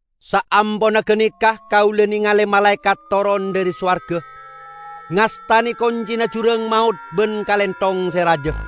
Saamponna ganeka kaula nengale malaekat toron dhari sowarga, ngastane koncina jurang maot ban kalenthong se raja.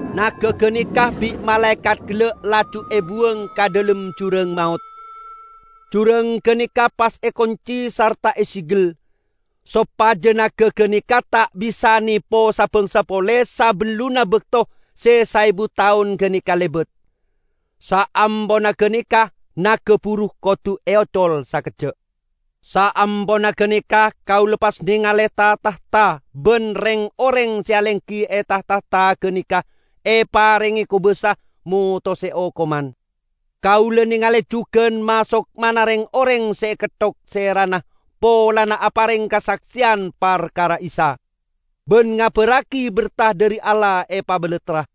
Naga ganeka bi' malaekat gella' laju ebuwang ka dhalem jurang maot, jurang ganeka pas ekonci sarta esegel, sopaja naga ganeka ta' bisa nepo sa-bangsa pole sabellunna bakto se saebu taon ganeka lebat. Saamponna ganeka naga buru kodu eocol sakejja'. Saamponna ganeka kaula pas nengale ta-tahta, ban reng-oreng se alenggi e ta-tahta ganeka eparenge kobasa motose okoman. Kaula nengale jugan ma-sokmana reng-oreng se eketthok serana polana apareng kasakseyan parkara Isa, ban ngabarragi berta dhari Allah epabalattra.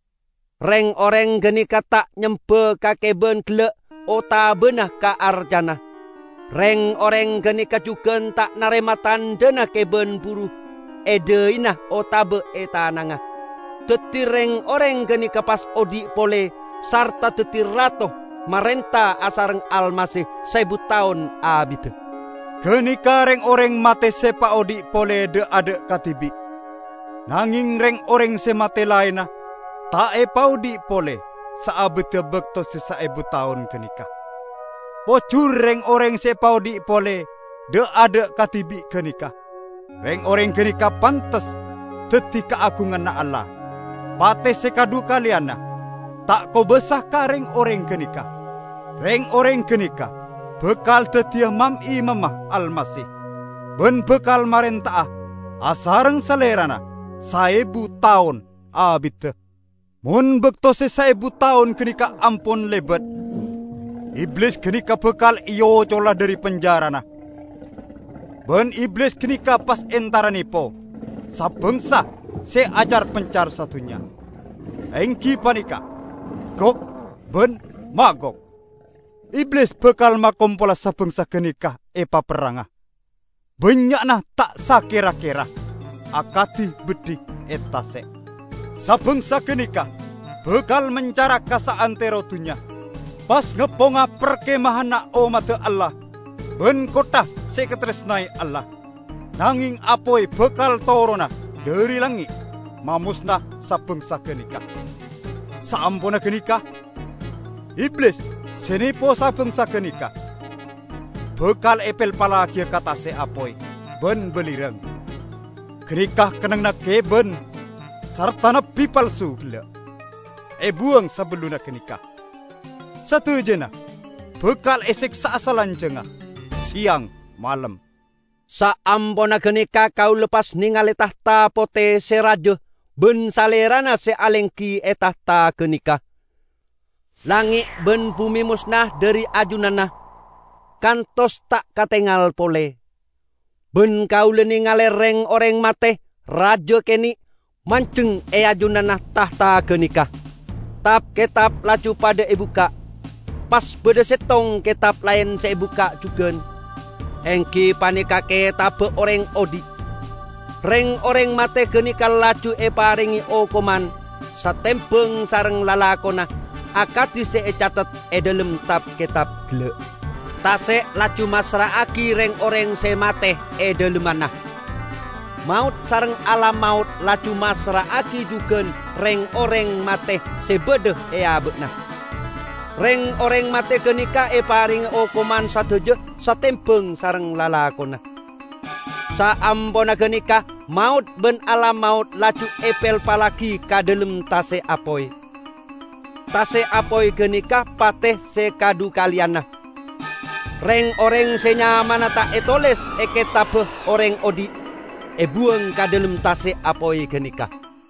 Reng-oreng ganeka ta' nyemba ka keban gella' otabana ka arcana. Reng-oreng ganeka jugan ta' narema tandhana keban buru e dhaina otaba e tanangnga. Daddi reng-oreng ganeka pas odhi' pole sarta daddi rato marenta asareng Almasih saebu taon abidda. Ganeka reng-oreng mate se epaodhi' pole dha'-adha' kadibi'. (Nangeng reng-oreng se mate laenna ta' epaodhi' pole saabidda bakto se saebu taon ganeka.) Pojur reng-oreng se epaodhi' pole dha'-adha' kadibi' ganeka. Reng-oreng ganeka pantes daddi kaagunganna Allah. Pate se kadhukaleyanna ta' kobasa ka reng-oreng ganeka. Reng-oreng ganeka bakal daddiya mam-imamma Almasih; ban bakal marenta'a asareng Salerana saebu taon abidda. Mon bakto se saebu taon ganeka ampon lebat, Iblis ganeka bakal eocola dhari penjarana, ban Iblis ganeka pas entara nepo sa-bangsa se acar-pencar sadunnya, enggi paneka Gog ban Magog. Iblis bakal makompola sa-bangsa ganeka epaperranga, bannya'na ta' sakera-kera, akadi beddhi e tase'. Sa-bangsa ganeka bakal mencara ka saantero dunnya, pas ngepponga parkemahanna ommadda Allah ban kottha se ekataresnae Allah. Nangeng apoy bakal torona dhari langnge' mamosna sa-bangsa ganeka. Saamponna ganeka, Iblis se nepo sa-bangsa ganeka, bakal epelpallagiya ka tase' apoy ban balirang. Ganeka kennengnganna keban sarta nabbi palsu gella' ebuwang sabellunna ganeka. Sadajana bakal eseksa'a salanjangnga, seyang malem. Saamponna ganeka kaula pas nengale tahta pote se raja ban Salerana se alenggi e tahta ganeka. Langnge' ban bume mosna dhari ajunanna, kantos ta' katengal pole. Ban kaula nengale reng-oreng mate, raja kene', manjeng e ajunanna tahta ganeka. Tab-ketab laju padha ebukka'. Pas badha settong ketab laen se ebukka' jugan, enggi paneka Ketabba Oreng Odhi'. Reng-oreng mate ganeka laju eparenge okoman, satembang sareng lalakonna akadi se ecathet e dhalem tab-ketab gella'. Tase' laju massra'agi reng-oreng se mate e dhalemmanna. Maot sareng Alam Maot laju massra'agi jugan reng-oreng mate se badha e aba'na. Reng-oreng mate ganeka eparenge okoman sadaja satembang sareng lalakonna. Saamponna ganeka Maot ban Alam Maot laju epelpallagi ka dhalem tase' apoy. (Tase' apoy ganeka pate se kadhukaleyanna.) Reng-oreng se nyamana ta' etoles e Ketabba Oreng Odhi', ebuwang ka dhalem tase' apoy ganeka.